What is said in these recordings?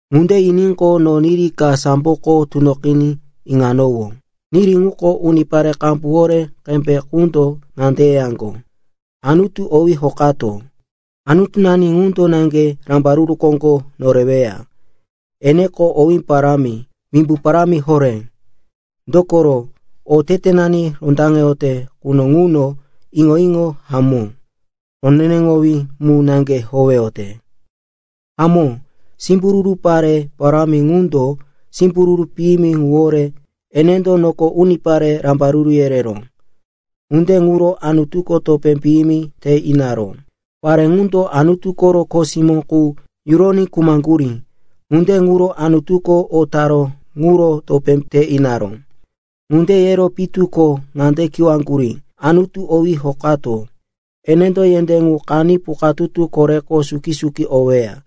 Ŋunde yiníqo, no niri ka samboko tunoqiní iŋanowó. Niri ŋuko unipare qambu horé qembe qundo ŋande yeyaŋgo, “Anutu owí hokato! Anutunani ŋundo naŋge rambaruru koŋgo noreweya. Eneko owé parámi, wimbu parámi horé. Dokoro otetenani rondaŋeyote quno ŋuno iŋo-iŋo hamó, roneneŋowí mu naŋge howeyote. Hamó, simbururu pare parámi ŋundo simbururu piyimi ŋuwore enendo noko unipare rambaruru yereró. Ŋunde ŋuro Anutuko topé piyimi te inaró. Pare ŋundo Anutu koro kho simó qu yuroní khumaŋgurí, ŋunde ŋuro Anutuko o taró ŋuro topé te inaró.” Ŋunde yero pitu ko ŋande kiwaŋgurí, “Anutu owí hokato! Enendo yendé ŋu qaní pukatutu koreko suki-suki oweya!”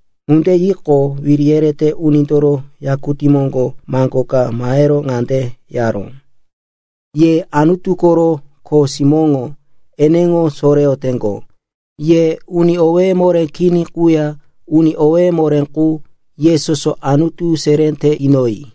Ŋunde yiqo, wiri yerete unindoro yakutí moŋgo maŋgo ka mahero ŋande yaró, “Ye Anutu koro kho simóŋo eneŋo soreyoteŋgo, ye uni owéye moré kini quya uni owéye moré qu, ye soso Anutu seré te inoyi!”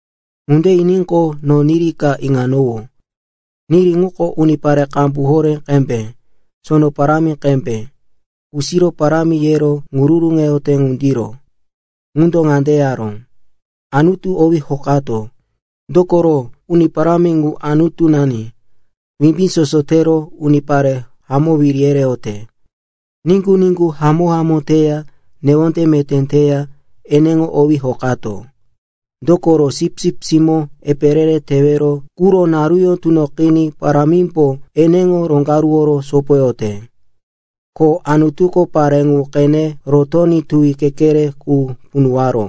Ŋunde yiníqo, no niri ka iŋanowó. Niri ŋuko unipare qambu horé qembe, sono parámi qembe, kusiro parámi yero ŋururuŋete ŋundiro. Ŋundo ŋande yaró, “Anutu owí hokato! Dokoro Uni Parámi ŋu, Anutunani, Wimbí Soso tero unipare hamó wiri yereyote! Niŋgu-niŋgu hamó-hamó teya newonde meté teya eneŋo owí hokato! Dokoro Sipsip Simó epe re-re tewero quro naruyó tunoqiní parímbo eneŋo roŋgaruworo sopoyote. Ko Anutuko pare ŋu qene rotoní tuwi kekere qu punuwaró.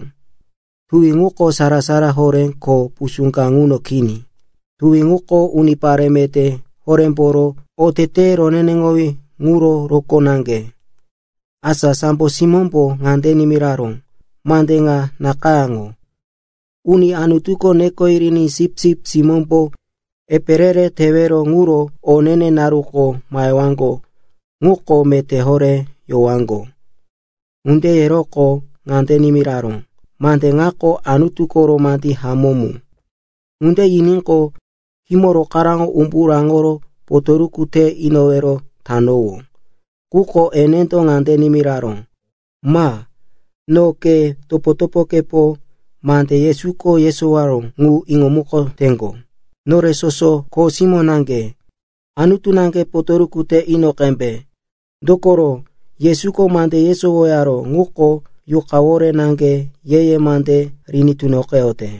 Tuwi ŋuko sara-sara horé ko pusú ka ŋuno kini. (Tuwi ŋuko unipare meté horémboro oteteye roneneŋowí ŋuro rokó naŋge.) Asa sambo simómbo ŋande nimiraró, “Mande ŋa nakayáŋo. Uni Anutuko neko yiriní Sipsip Simómbo epe re-re tewero ŋuro o ne-ne naruko mahewaŋgo ŋuko meté horé yowaŋgo.” Ŋunde yeroqo ŋande nimiraró, “Mande ŋako Anutu koro mande hamó mu.” Ŋunde yiníqo, khímo rokaráŋo umbu raŋoro potoruku te inowero tanowó. Quko enendo ŋande nimiraró, “Ma. No, ke, topo-topokepo mande Yesuko yesowaró ŋu iŋomukoteŋgo, nore soso kho simó naŋge. Anutu naŋge potoruku te ino qembe. Dokoro Yesuko mande yesowaró ŋuko Yuqawore naŋge ye-ye mande riní tunoqeyote.”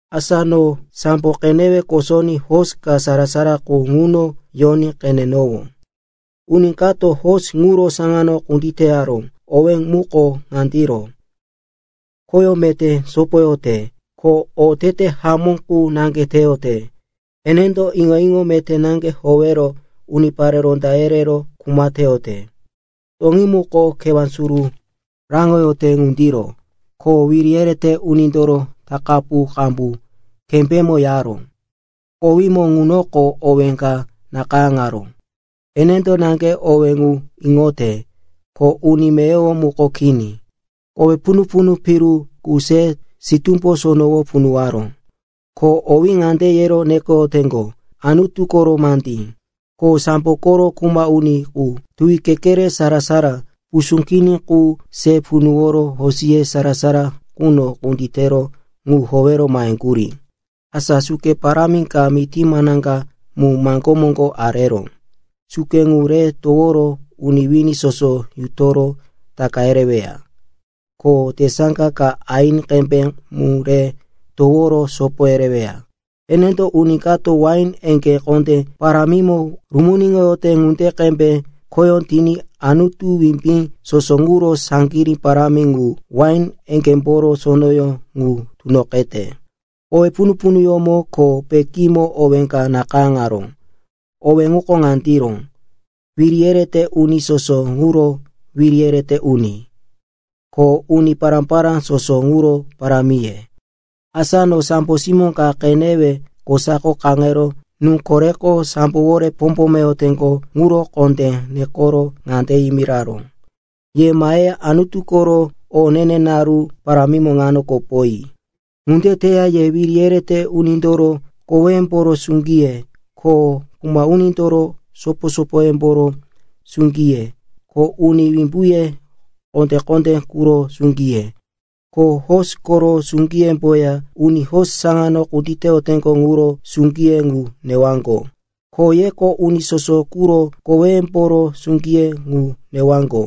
Asa no sambo qenewe kosoní hosi ka sara-sara qu ŋuno yoní qenenowó. Uni kato hosi ŋuro saŋano kunditeyaró, owí muko ŋandiro: “Khoyó meté sopoyote,” ko “Otete hamó qu naŋge teyote.” Enendo iŋo-iŋo meté naŋge howero unipare ronda yerero kuma teyote. Toŋí muko kewá suru raŋoyote ŋundiro, ko wiri yerete unindoro takapu qambu kembémo yaró. Kowímo ŋunoko owé ka nakayáŋaró. Enendo naŋge owé ŋu iŋote, ko uni meyowo muko kini. Kowe punu-punu piru qu re sitúmbo sonowo punuwaró. Ko owí ŋande yero nekoyoteŋgo, “Anutu koro mandí.” Ko sambo koro kuma uni qu tuwi kekere, sara-sara, pusú kini ŋu se punuworo hosiye sara-sara quno kunditero ŋu howero maheŋgurí. Asa suke parámi ka mití manaŋga mu maŋgó moŋgo areró. Suke ŋu re toworo uni wini soso yutoro taka yereweya, ko tesaŋga ka aini qembe mu re toworo sopo yereweya. Enendo uni kato wain eŋgé kondó parámimo rumuniŋoyote ŋunde qembe khoyó tiní Anutu Wimbí Soso ŋuro saŋgirí parámi ŋu wain eŋgémboro sonoyó ŋu tunoqete. Kowe punu-punuyómo ko pekímo owé ka nakayáŋaró. Owé ŋuko ŋandiro: “Wiri yerete Uni soso ŋuro Wiri yerete Uni, ko Uni Pará-pará soso ŋuro Parámiye.” Asa no sambo simó ka qenewe kosako kaŋero nú koreko sambowore pombomeyoteŋgo ŋuro kondé nekero ŋande yimiraró, “Ye maheya Anutu koro o ne-ne naru parámimo ŋano kopoyi! Ŋunde teya ye wiri yerete unindoro koweyemboro suŋgiye, ko kuma unindoro sopo-sopoyemboro suŋgiye, ko uni wimbuye kondé-kondé quro suŋgiye, ko hosi koro suŋgiyemboya uni hosi saŋano kunditeyoteŋgo ŋuro suŋgiye ŋu newaŋgo. Ko yeko uni soso quro koweyemboro suŋgiye ŋu newaŋgo,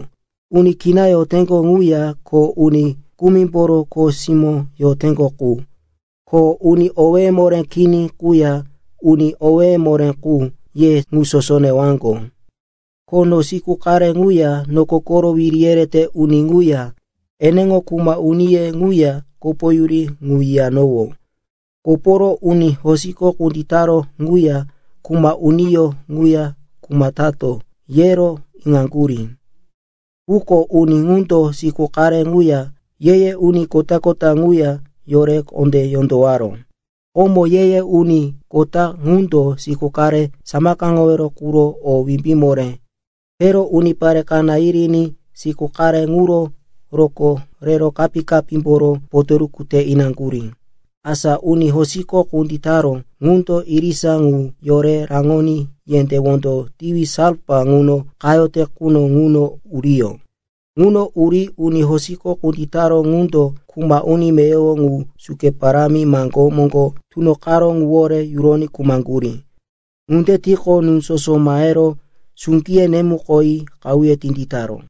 uni kina yoteŋgo ŋuya ko uni kumimboro kho simó yoteŋgo qu, ko uni owéye moré kini quya uni owéye moré qu, ye ŋu soso newaŋgo.” Ko no siku qare ŋuya noko koro wiri yerete uni ŋuya, eneŋo kuma uniye ŋuya kopoyuri ŋu yiyanowó. Koporo, uni hosiko kunditaró ŋuya kuma uniyó ŋuya kuma tato, yero iŋaŋgurí. Quko uni ŋundo siku qare ŋuya ye-ye uni kota ŋuya yore kondé yondowaró. Komo ye-ye uni kota ŋundo siku qare samakaŋowero quro o wimbí moré tero unipare kaná yiriní siku qare ŋuro rokó rero kapí-kapímboro potoruku te inaŋgurí. Asa uni hosiko kunditaró ŋundo irisa ŋu yore raŋoní yendé wondo tiwi salfa ŋuno qayote quno ŋuno uriyó. Ŋuno uri uni hosiko kunditaró ŋundo kuma uni meyowo ŋu suke parámi maŋgó moŋgo tunoqaró ŋuwore yuroní khumaŋgurí. Ŋunde tiqo, nú soso mahero suŋgiye nemukoyi qahuye tinditaró.